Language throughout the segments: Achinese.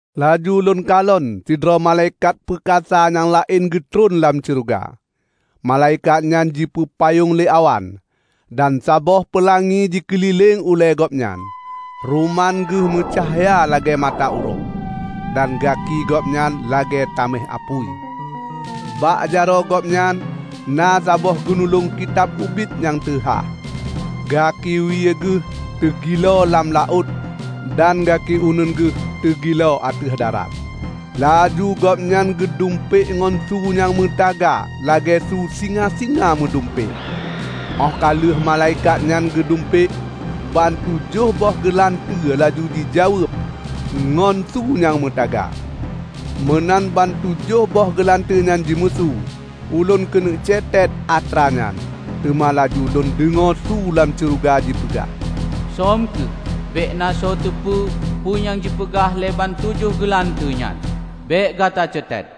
Laju lôn kalon sidroe malaikat peukasa nyang laén geutreun lam syeuruga. Malaikat nyan jipeupayong lé awan, dan saboh peulangi jikeulileng ulée gobnyan. Ruman geuh meucahya lagée mata uroe, dan gaki gobnyan lagée taméh apui. Bak jaroe gobnyan na saboh geunulong kitab ubit nyang teuhah. Gaki wie geuh teugilo lam laôt dan gaki uneuen geuh teugilo ateueh darat. Laju gobnyan geudumpék ngon su nyang meutaga lagée su singa-singa meudumpék. Óh ka lheueh malaikat nyan geudumpék, ban tujoh boh geulanteue laju jijaweueb ngon su nyang meutaga. Meunan ban tujoh boh geulanteue nyan jimeusu, ulôn keuneuk cetet atra nyan, teuma laju lôn deungoe su lam syeuruga jipeugah, "Söm kheueh bék na soe teupeu peue nyang jipeugah lé ban tujoh geulanteue nyan; bék gata cetet!"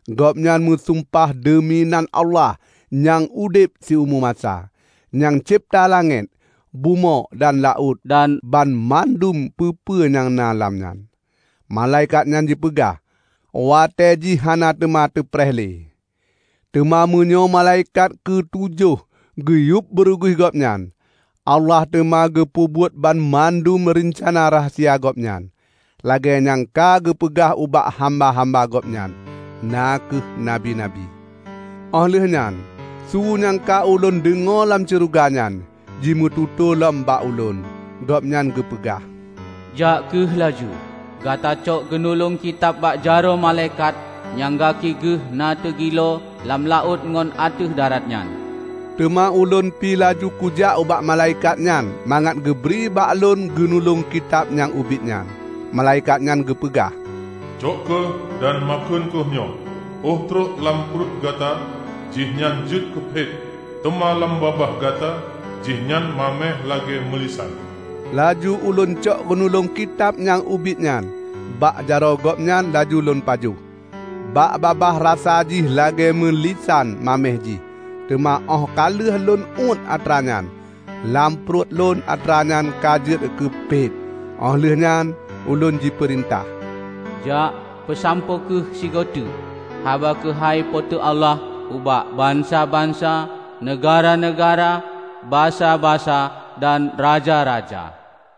Gobnyan meusumpah deumi nan Allah nyang udeb siumu masa, nyang cebta langét, bumoe dan laôt dan banmandum peue-peue nyang na lam nyan. Malaikat nyan jipeugah, "Watée jih hana teuma teupeupreh lé! Teuma meunyoe malaikat keu tujoh geuyueb beureuguih gobnyan, Allah teuma geupeubuet banmandum reucana rahsia Gobnyan, lagée nyang ka geupeugah ubak hamba-hamba Gobnyan, na kheueh nabi-nabi." Óh lheueh nyan su nyang ka ulôn deungoe lam syeuruga nyan, jimeututoe lom bak ulôn. Gobnyan geupeugah, "Jak kheueh laju gata cok geunulong kitab bak jaroe malaikat nyang gaki geuh na teugilo lam laôt ngon ateueh darat nyan." Teuma ulôn pi laju kujak ubak malaikat nyan mangat geubri bak lôn geunulong kitab nyang ubit nyan. Malaikat nyan geupeugah, "Cok kheueh dan makheun kheueh nyoe. Óh trok lam pruet gata jihnyan jeuet keu phet, teuma lam babah gata jihnyan maméh lagée meulisan." Laju ulôn cok geunulong kitab nyang ubit nyan bak jaroe gobnyan laju lôn pajoh. Bak babah rasa jih lagée meulisan maméh jih, teuma óh ka lheueh lôn uét atra nyan, lam pruet lôn atra nyan ka jeuet keu phet. Óh lheueh nyan ulôn jipeurintah, "Jak peusampoe kheueh sigoe teuk haba keuhai Po teu Allah ubak bansa-bansa, neugahra-neugahra, basa-basa dan raja-raja."